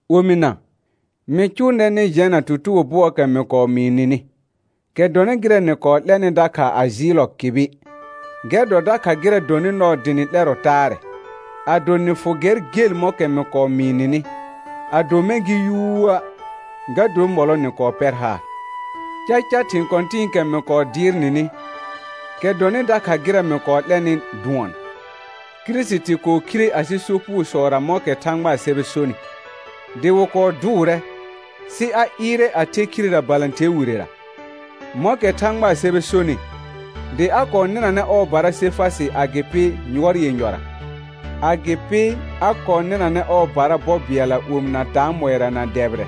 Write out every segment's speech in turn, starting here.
Omɩna, mɩ cʋʋ nɛr nɩ jɛna tutugo bʋɔɔkɛ mɩ kɔɔ mɩɩ nɩnɩ, kɛ dɔnɩ gɩrɛ nɩ kɔɔ 'lɛnɩ dakha a jɩɩllɔ kɩbɩ. Gɛr dɔ dakha gɩrɛ dɔnɩ nɔɔ dɩ nɩ 'lɛrɔ taarɛ, ado nɩ fʋ gɛr gel mɔ̃kɛ mɩ kɔɔ mɩɩ nɩnɩ; ado mɛ̃ gɩ yuuə', ga dor mɔlɔ nɩ kɔɔ pɛr haar. Caca thɩ̃ kɔ̃tɩ̃ɩkɛ mɩ kɔɔ dɩɩr nɩnɩ, kɛ dɔnɩ dakha gɩrɛ mɩ kɔɔ 'lɛnɩ dʋɔn: Kirisiti kɔɔ khire asɩ sopugosɔra mɔ̃kɛ Thãgbaa sɛbɛ sonɩ, dɩ wɩ kɔɔ dʋʋrɛ, sɩ a ɩɩrɛ a the khirera balãther wirera, mɔ̃kɛ Thãgbaa sɛbɛ sonɩ, dɩ a kɔɔ nɩnanɛ ɔɔbara Sefasɩ agɩpɩ yʋɔr yenyɔra. Agɩpɩ a kɔɔ nɩnanɛ ɔɔbara bɔ bɩɛlla omɩna taamɔɩra na dɛbɩrɛ,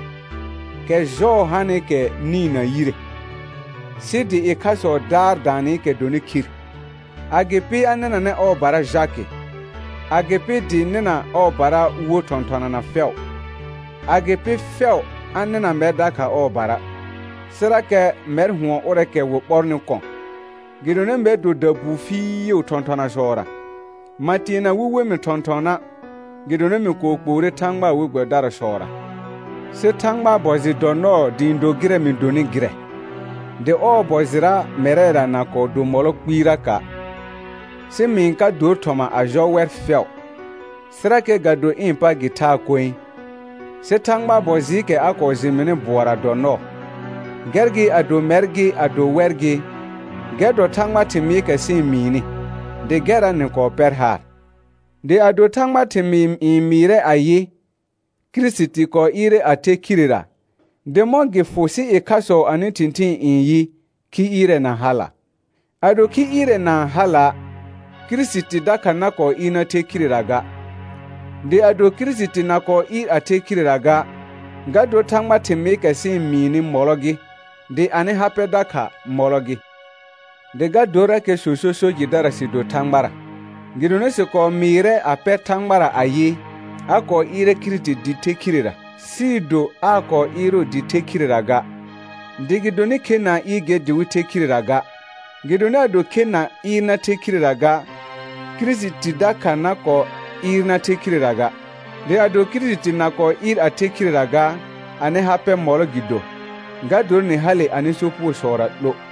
kɛ jɔɔ hanɩkɛ nĩ na yire, sɩ dɩ ɩkhasɔ daar daanɩkɛ dɔnɩ khir. Agɩpɩ a nɩnanɛ ɔɔbara Jakɩ, agɩpɩ dɩ nɩna ɔɔbara wo thɔ̃thɔnana fɛʋ. Agɩpɩ fɛʋ a nɩna mɛr dakha ɔɔbara, sɩrakɛ mɛr hʋɔn ʋrɛɛkɛ wɩ ɓɔrnɩ kɔ̃. Gɩdonɩ mɛr dɔ dabuu fɩɩʋ thɔ̃thɔnasɔra, ma teena wɩ we mɩ thɔ̃thɔna', gɩdonɩ mɩ kɔɔ kpoore Thãgbaa we gbɛbɩdarasɔra. Sɩ Thãgbaa bɔ jɩ dɔ nɔɔ dɩ ɩ̃ do gɩrɛ mɩ donɩ gɩrɛ, dɩ ɔɔ bɔ jɩra mɛrɛra na kɔɔ do mɔlɔ kpɩɩraka', sɩ mɩ-n ka dor thɔma a jɔ wɛr fɛʋ, sɩrakɛ ga do ɩ̃ pa gɩ thaa koe, sɩ Thãgbaa bɔ jɩɩkɛ a kɔɔ jɩ mɩnɩ bʋɔra dɔ nɔɔ. Gɛr gɩ ado mɛr gɩ ado wɛr gɩ, gɛr dɔ Thãgbaa thɩmɩɩkɛ sɩ-n mɩɩnɩ, dɩ gɛrra nɩ kɔɔ pɛr haar. Dɩ ado Thãgbaa thɩmɩɩ n mɩɩrɛ ayɩ: Kirisiti kɔɔ ɩɩrɛ a the khirera, dɩ mɔ̃ gɩ fʋ sɩ ɩkhasɔ anɩ thɩ̃thɩɩn n yɩ: Khi ɩɩrɛ na hala? Ado khi ɩɩrɛ na-n hala', Kirisiti dakha na kɔɔ ɩɩr na the khirera ga. Dɩ ado Kirisiti na kɔɔ ɩɩr a the khirera ga, ga dor Thãgbaa thɩmɩɩkɛ sɩ-n mɩɩnɩ mɔlɔ gɩ, dɩ anɩ ha pɛ dakha mɔlɔ gɩ. Dɩ ga dorakɛ sõso so jɩdara sɩ do Thãgbara, gɩdonɩ sɩ kɔɔ mɩɩrɛ a pɛr Thãgbara ayɩ, a kɔɔ ɩɩrɛ Kirisiti dɩ the khirera, sɩɩ do aa kɔɔ ɩɩrʋʋ dɩ the khirera ga, dɩ gɩdonɩ khe na-n ɩɩr ger dɩ wɩ the khirera ga. Gɩdonɩ ado khe na ɩɩr na the khirera ga, Kirisiti dakha na kɔɔ ɩɩr na the khirera ga. Dɩ ado Kirisiti na kɔɔ ɩɩr a the khirera ga, anɩ ha pɛ mɔlɔ gɩ do, ga dor nɩ hale anɩ sopugosɔra 'lo;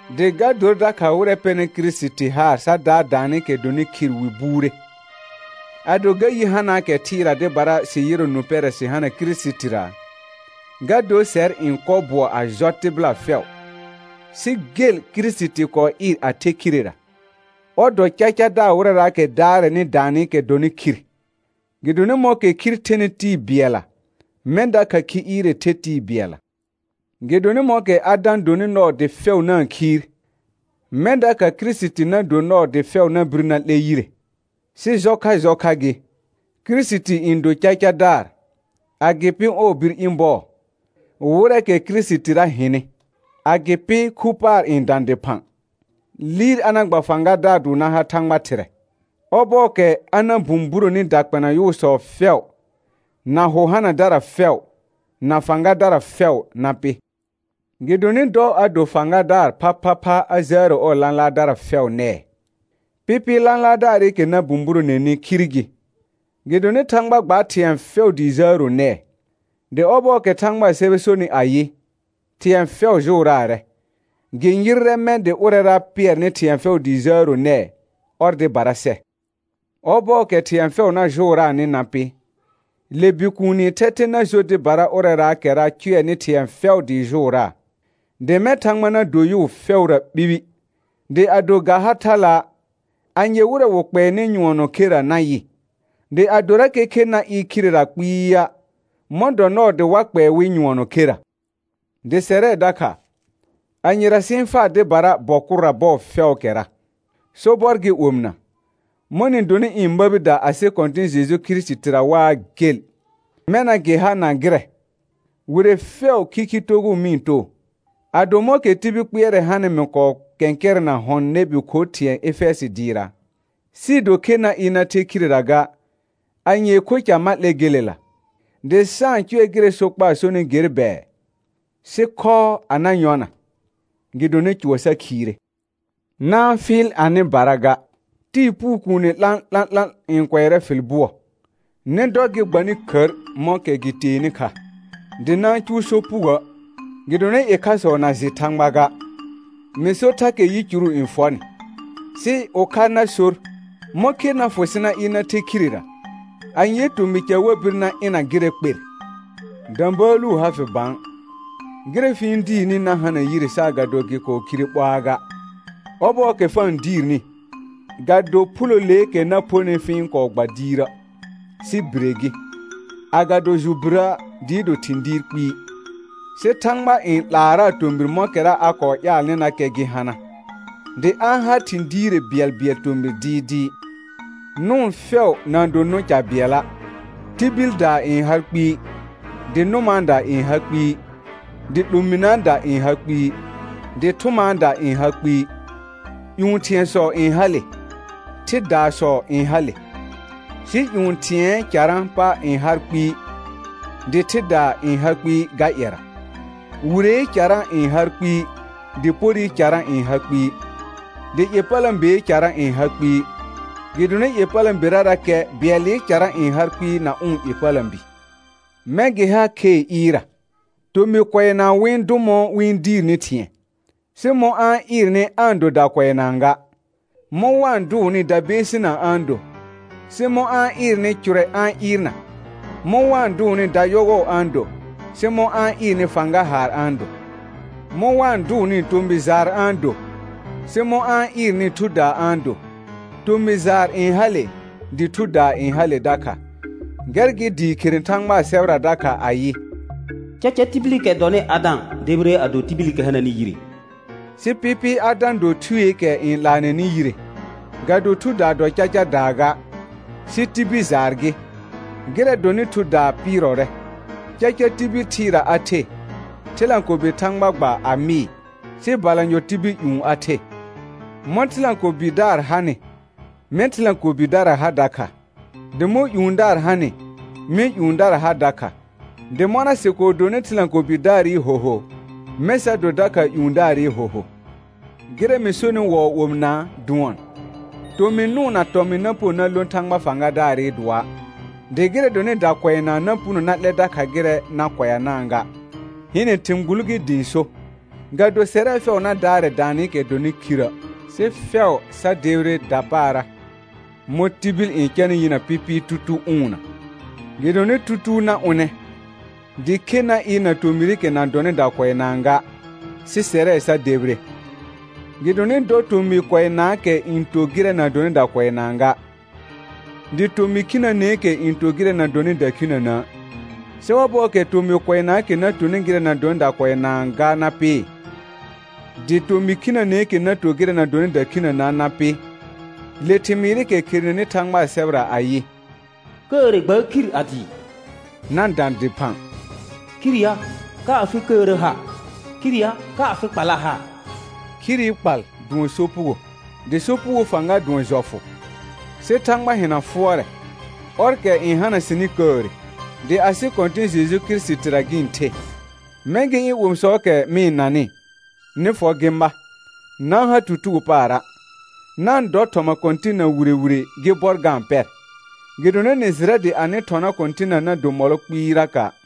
dɩ ga dor dakha wɩrɛ pɛnɩ Kirisiti haar sa daar daanɩkɛ dɔnɩ khir wɩ buure. Ado ga yi hanaakɛ thɩɩra dɩbara sɩ yɩrɔ nũ pɛrɛ sɩ hana Kirisitira, ga dor sɛr n kɔ bʋɔ a jɔ tɩbɩla fɛʋ. Sɩ gel Kirisiti kɔɔ ɩɩr a the khirera, ɔr dɔ cacadaar wɩrɛraakɛ daarɛnɩ daanɩkɛ dɔnɩ khir. Gɩdonɩ mɔ̃kɛ khir thenɩ tɩɩ bɩɛlla, mɛ̃ dakha khi ɩɩrɛ the tɩɩ bɩɛlla. Gɩdonɩ mɔ̃kɛ Adã donɩ nɔɔ dɩ fɛʋ na-n khiir, mɛ̃ dakha Kirisiti na do nɔɔ dɩ fɛʋ na bir na 'lɛ yire; sɩ jɔ kha jɔ kha gɩ, Kirisiti n do cacadaar, agɩpɩ ɔɔ bir ɩ̃ bɔɔ, wɩrɛɛkɛ Kirisitira hɩnɩ. Agɩpɩ khu paar n dã dɩphã, liir a na gba fãgadaar dʋʋr na ha Thãgba Thɩrɛ, ɔbɔɔkɛ a na bũburoni dakpɛna yʋʋsɔ fɛʋ, na hʋ hanadara fɛʋ, na fãgadara fɛʋ na pɩ. Gɩdonɩ dɔ a do fãgadaar phaphapha a jəəro ɔɔ lãlaardara fɛʋ nɛɛ. Pɩpɩɩ lãlaardaarɩkɛ na bũburoneni khir gɩ, gɩdonɩ «Thãgba gbaar thɩ̃ɛ fɛʋ dɩ jəəro nɛɛ.» Dɩ ɔbɔɔkɛ Thãgbaa sɛbɛ sonɩ ayɩ, thɩ̃ɛ fɛʋ jʋʋraarɛ, gɩ yɩrrɛ mɛ̃ dɩ ʋrɛra pɩɛrnɩ thɩ̃ɛ fɛʋ dɩ jəəro nɛɛ, ɔr dɩbara sɛ. Ɔbɔɔkɛ thɩ̃ɛ fɛʋ na jʋʋraanɩ na pɩ, le Bikuuni thɛthɛ na jo dɩbara ʋrɛraakɛra cʋɛnɩ thɩ̃ɛ fɛʋ dɩɩ jʋʋraa, dɩ mɛ̃ Thãgba na do yʋʋ fɛʋra ɓibi. Dɩ ado ga ha thala', anye wɩrɛ wɩ kpɛɛnɩ nyʋɔnɔ kherə na yɩ? Dɩ adorakɛ khe na ɩɩr khirera kpɩɩa', mɔ̃ dɔ nɔɔ dɩ wa kpɛɛ wɩ nyʋɔnɔ kherə? Dɩ sɛrɛ dakha, anyera sɩ-n faa dɩbara bɔ kʋrra bɔɔ fɛʋʋkɛra? Sobɔr gɩ omɩna, mɔ̃ nɩ donɩ ɩ̃ məbida asɩ Kɔ̃tɩ̃ Jeju Kirisitira waa gel, mɛna gɩ ha na gɩrɛ, wire fɛʋ khikhi togʋʋ mɩ-n too. Ado mɔ̃kɛ tibil kpɩɛrɛ hanɩ mɩ kɔɔ kɛ̃kɛrɛna hɔ̃ nɛbi kho thɩ̃ɛ Efɛjɩ dɩɩra, sɩɩ do khe na ɩɩr na the khirera ga, anyee kho ca ma 'lɛ gelela? Dɩ sa-n cʋɛ gɩrɛ sokpaa sɔnɩ ger bɛɛ: «Sɩ khɔɔ a na yɔna, gɩdonɩ cʋɔ sa khiire.» Na-n fɩɩl anɩbara ga: Tɩɩ puu kuune 'lã'lã'lã n kʋɛrɛ fɩl bʋɔ. Nɩ dɔ gɩ gba nɩ khər mɔ̃kɛ gɩ teenɩ kha, dɩ na-n cʋʋ sopugoə', gɩdonɩ ɩkhasɔ na jɩ Thãgba ga. Mɩ sor thakɛ yicuru n fɔ nɩ. Sɩ ʋkha na sor: Mɔ̃ khe na fʋ sɩ na ɩɩr na the khirera? Anyee tomɩ ca wa bir na ɩna gɩrɛ kper? Də̃bəəlu ha fɩ bã; gɩrɛ fɩ-n diirni na hana yire saagado gɩ kɔɔ khire ɓoaa ga. Ɔbɔɔkɛ fa-n diirni, ga do phuloleekɛ na phonɩ fɩ-n kɔɔ gba diirə', sɩ bire gɩ, agado jʋ birə' dɩɩ do thɩ̃ diir kpɩɩ. Sɩ Thãgba n 'laaraa tomɩr mɔ̃kɛra a kɔɔ ƴaalnɩnakɛ gɩ hana, dɩ a-n har thɩ̃ diire bɩɛlbɩɛl tomɩr dɩɩdɩɩ. Nʋʋn fɛʋ na-n do nʋ̃ ca bɩɛla', tibildaa n har kpɩɩ, dɩ nʋmaada n ha kpɩɩ, dɩ 'lominəəda n ha kpɩɩ, dɩ thʋmaada n ha kpɩɩ. Yu thɩ̃ɛsɔ n hale, thɩdaasɔ n hale, sɩ ƴũ thɩ̃ɛɛ carã pa n har kpɩɩ, dɩ thɩdaa n ha kpɩɩ ga ƴɛra. Wiree carã n har kpɩɩ, dɩ porɩ carã n ha kpɩɩ, dɩ ƴepələ̃bee carã n ha kpɩɩ, gɩdonɩ ƴepələ̃berarakɛ bɩɛlɩ carã n har kpɩɩ na ʋ̃ ƴepələ̃bi. Mɛ̃ gɩ ha khee ɩɩrra, tomɩ kʋɛnaa wɩ-n dʋ mɔ̃ wɩ-n diirni thɩ̃ɛ, sɩ mɔ̃ a-n ɩɩrnɩ aa-n do dakʋɛnaa ga. Mɔ̃ wa-n dʋʋnɩ dabeesinaa a-n do, sɩ mɔ̃ a-n ɩɩrnɩ cʋrɛ a-n ɩɩrna. Mɔ̃ wa-n dʋʋnɩ dayɔgɔ a-n do, sɩ mɔ̃ a-n ɩɩrnɩ fãga haar a-n do. Mɔ̃ wa-n dʋʋnɩ tomɩ jaar a-n do, sɩ mɔ̃ a-n ɩɩrnɩ thudaa a-n do; tomɩ jaar n hale, dɩ thudaa n hale dakha. Gɛr gɩ dɩɩ khere Thãgbaa sɛbɛra dakha ayɩ: «Caca tibilikɛ dɔnɩ Adã debire a do tibilikɛ hananɩ yire», sɩ pɩpɩɩ Adã do thueekɛ n 'laanɛnɩ yire. Ga do thudaa dɔ cacadaa ga, sɩ tibil jaar gɩ, gɩrɛ dɔnɩ thudaa pɩɩrɔrɛ. Caca tibil thɩɩra a the, thɩlãkobe Thãgba gba a mɩɩ, sɩ balanyɔ tibil ƴũ a the. Mɔ̃ thɩlãkobidaar hanɩ, mɛ̃ thɩlãkobidara ha dakha, dɩ mɔ̃ ƴũdaar hanɩ, mɛ̃ ƴũdara ha dakha. Dɩ mɔna sɩ kɔɔ donɩ thɩlãkobidaarɩ hoho, mɛ̃ sa do dakha ƴũdaarɩ hoho. Gɩrɛ mɩ sonɩ wɔɔ omɩnaa dʋɔn: Tomɩ nʋʋn na tɔmɩn na puno na lõ Thãgba fãgadaarɩ dʋɔa', dɩ gɩrɛ dɔnɩ dakʋɛnaa na puno na 'lɛ dakha gɩrɛ na kʋɛanaa ga. Hɩnɛ thɩ̃ gbul gɩ dɩ ɩ̃ so, ga do sɛrɛ fɛʋ na daarɛ daanɩkɛ dɔnɩ khirə', sɩ fɛʋ sa debire dapaara, mɔ̃ tibil n canɩ yinə pɩpɩɩ tutuu ʋʋnna. Gɩdonɩ tutuu na ʋnɛ, dɩ khe na ɩɩr na tomɩrɩkɛ na dɔnɩ dakʋɛnaa ga, sɩ sɛrɛ sa debire. Gɩdonɩ dɔ tomɩ kʋɛnaakɛ n to gɩrɛ na dɔnɩ dakʋɛnaa ga, dɩ tomɩ khinəneekɛ n to gɩrɛ na dɔnɩ dakhinənə'. Sɩ ɔbɔɔkɛ tomɩ kʋɛnaakɛ na tonɩ gɩrɛ na dɔnɩ dakʋɛnaa ga na pɩ, dɩ tomɩ khinəneekɛ na to gɩrɛ na dɔnɩ dakhinənə' na pɩ, le thɩmɩɩrɩkɛ kherenenɩ Thãgbaa sɛbɛra ayɩ: «Kəəre gbaar khir a dɩɩ» na dã dɩphã. «Khir ya, ka afɩ kəəra ha? Khir ya, ka afɩ kpalla ha?» Khiri kpal dʋɔn sopugo, dɩ sopugoo fãga dʋɔn jɔfʋ. Sɩ Thãgba hɩna fʋɔrɛ, ɔrkɛ n hana sɩnɩ kəəre, dɩ asɩ Kɔ̃tɩ̃ Jeju Kirisitira gɩ-n the. Mɛ̃ gɩ ɩ̃ omisɔɔkɛ mɩ-n nanɩ, nɩ fɔ gɩ ma, na-n ha tutugo paara', na-n dɔ thɔma Kɔ̃tɩnna wire wire gɩ bɔr ga-n pɛr, gɩdonɩ nɩ jɩrɛ dɩ anɩ thɔna Kɔ̃tɩnna na do mɔlɔ kpɩɩraka'.